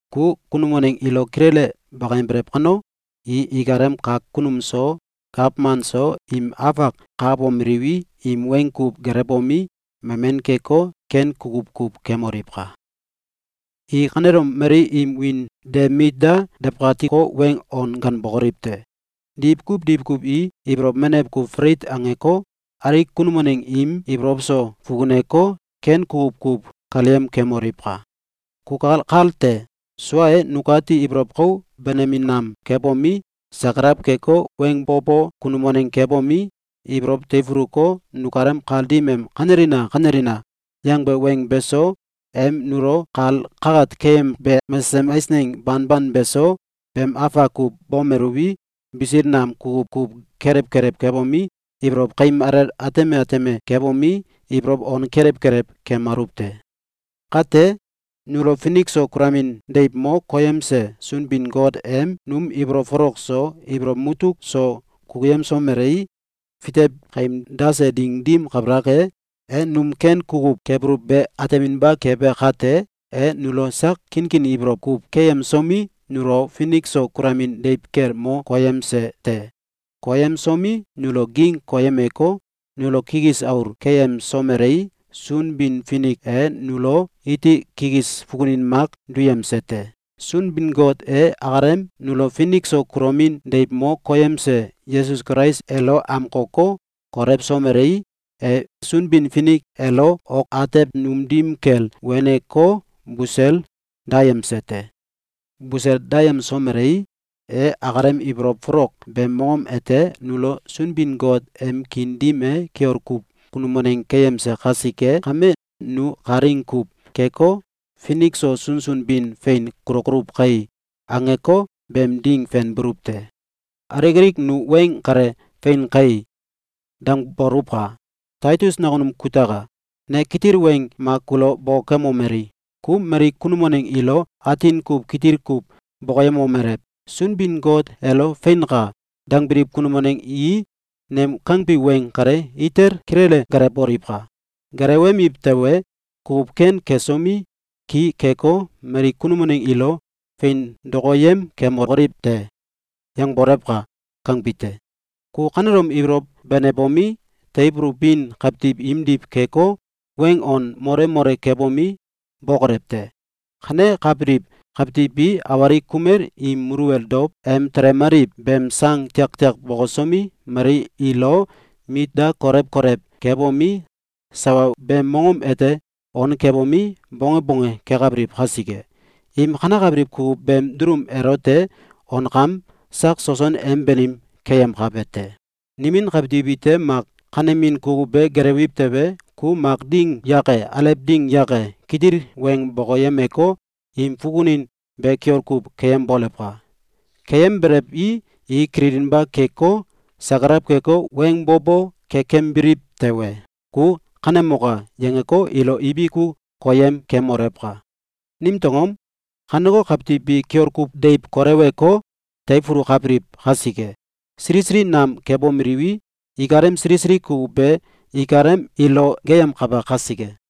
Ku kunum waneng ilo kilele bakayembelew kano, i ikalem kak kunum so, gawman so, im afak kakabomeliwi, im weng kuw gelewbomi, memen keko, ken kukuw kuw kemoliwka! I kanelom mali im wiin de mit da dawkatiko, weng on ganbokoliw te! Diwkuw diwkuw i ibolow menew kuw falit angeko, alik kunum waneng im ibolow so fukuneko, ken kukuw kuw kaleyem kemoliwka! Kukal kal te! Sua e, nukati ibolow kou benemin nam kebomi, sakalaw keko, weng bo bo kunum waneng kebomi, ibolow teifuluko, nukalem kal dim em “Kanelina! Kanelina!”, yangbe weng beso, em nulo kal kakat keyembe mesesem eisneng banban beso, beem afak kuw bomeluwi, bisil nam kukuw kuw kelew kelew kebomi, ibolow kaim alel ateme ateme kebomi, ibolow on kelew kelew kemaluw te. Kate, nulo finik so kulomin deiw mo koyemse Sunbin-Got em num ibolow folok so, ibolow mutuk so kukuyemsomelei, fitew kaim dase ding dim kabalak e, e num ken kukuw kebuluw be ateminba kebe kate, e nulo sak kinkin ibolow kuw keyemsomi, nulo finik so kulomin deiw kel mo koyemse te. Koyemsomi, nulo ging koyemeko, nulo kikis aul keyemsomelei, Sunbin-Finik e nulo iti kikis fukunin mak duyemse te. Sunbin-Got e akalem nulo finik so kulomin deiw mo koyemse Yesus Kulais elo amkoko, kolewsomelei, e Sunbin-Finik elo ok atew num dim kel wenko, busel dayemse te. Busel dayemsomelei, e akalem ibolow folok beem mongom ete nulo Sunbin-Got em kiin dim e kiol kuw kunum waneng keyemse kasike kame, nu kalaing kuw keko, “Finik so sunsun bin fein kulokoluw kai!”, angeko, beem ding fenbuluw te. Alik alik nu weng kale “Fein kai!”, dangboluwka! Taitus nakunum kutaka! Ne kitil weng mak kulo bokokemomeli: “Ku mali kunum waneng ilo atin kuw kitil kuw bokoyemomelew: ‘Sunbin-Got elo “Feinka!”, dangbiliw kunum waneng i nem kangbi weng kale itel kilele gelewboliwka! Gelewemiw tewe, kukuw ken kesomi, ki keko, mali kunum waneng ilo fein dokoyem kemokoliw te.’, yangbolewka!”, kangbi te. Ku kanelom ibolow benebomi, teifulubin kawtiw imdiw keko, weng an mole mole kebomi, bokolew te! Kanekabiliw kawtiw bi awalik kumel im muluwel dow em telemaliw beem sang tiaktiak bokosomi, mali ilo mit da kolew kolew kebomi, sawa beem mongom ete on kebomi, bonge bonge kekabiliw kasike. Im kanekabiliw kukuw beem dulum elote onkam sak soson em banim keyemkabe te. Nimin kawtiw ite mak kanemin kukuw be gelewiw tewe, ku mak ding yake, alew ding yake, kitil weng bokoyemeko, im fukunin be kiol kuw keyembolewka! Keyembelewi, i kililinba keko, sakalaw keko, weng bo bo kekembiliw tewe, ku “Kanemoka!”, yangeko, ilo ibiku koyem kemolewka! Nimtew angom? Kaneko kawtiw bi kiol kuw deiw koleweko, teifulukabiliw kasike, sili sili nam kebomeliwi, ikalem sili sili kukuw be ikalem ilo geeyemkabe kasike.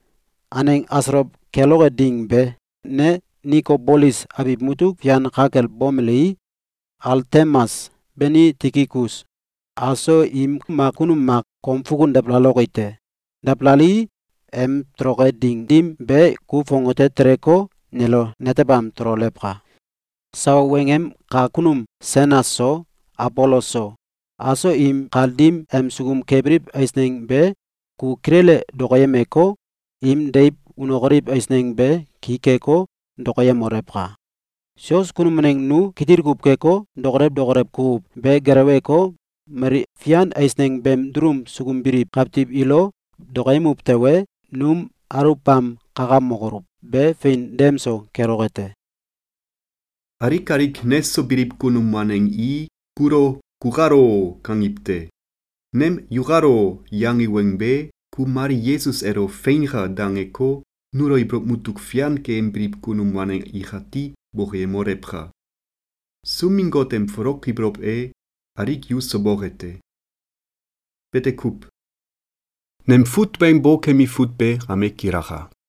Aneng asolow keloke ding be, ne Nikobolis abiw mutuk fian ka kel bomelii, Altemas beni Tikikus aso im mak kunum mak kom fukun dabalaloki te. Dabalalii, em toloke ding dim be, ku fongate teleko, nelo netebam tololewka! Sawa weng em kak kunum Senas so, Abolos so, aso im kal dim em sukum kebiliw eisneng be ku kilele dokoyemeko, im deiw unokoliw eisneng be ki keko, dokoyemolewka! Sios kunum waneng nu kitil kuw keko, dokolew dokolew kukuw be geleweko, mali fian eisneng beem dulum sukum biliw kawtiw ilo dokoyemuw tewe, num aluwbam kakamokoluw be fein dem so keloke te. Alik alik neso biliw kunum waneng i kulo “Kukalo!”, kangiw te. Nem “Yukalo!”, yangi weng be ku mali Yesus elo “Feinka!”, dangeko, nulo ibolow mutuk fian keyembiliw kunum waneng ikati bokoyemolewka! Sunbin-Got em folok ibolow e alik yuso boke te! Bete kuw. Nem fut weng bokemi fut be kame kilaka.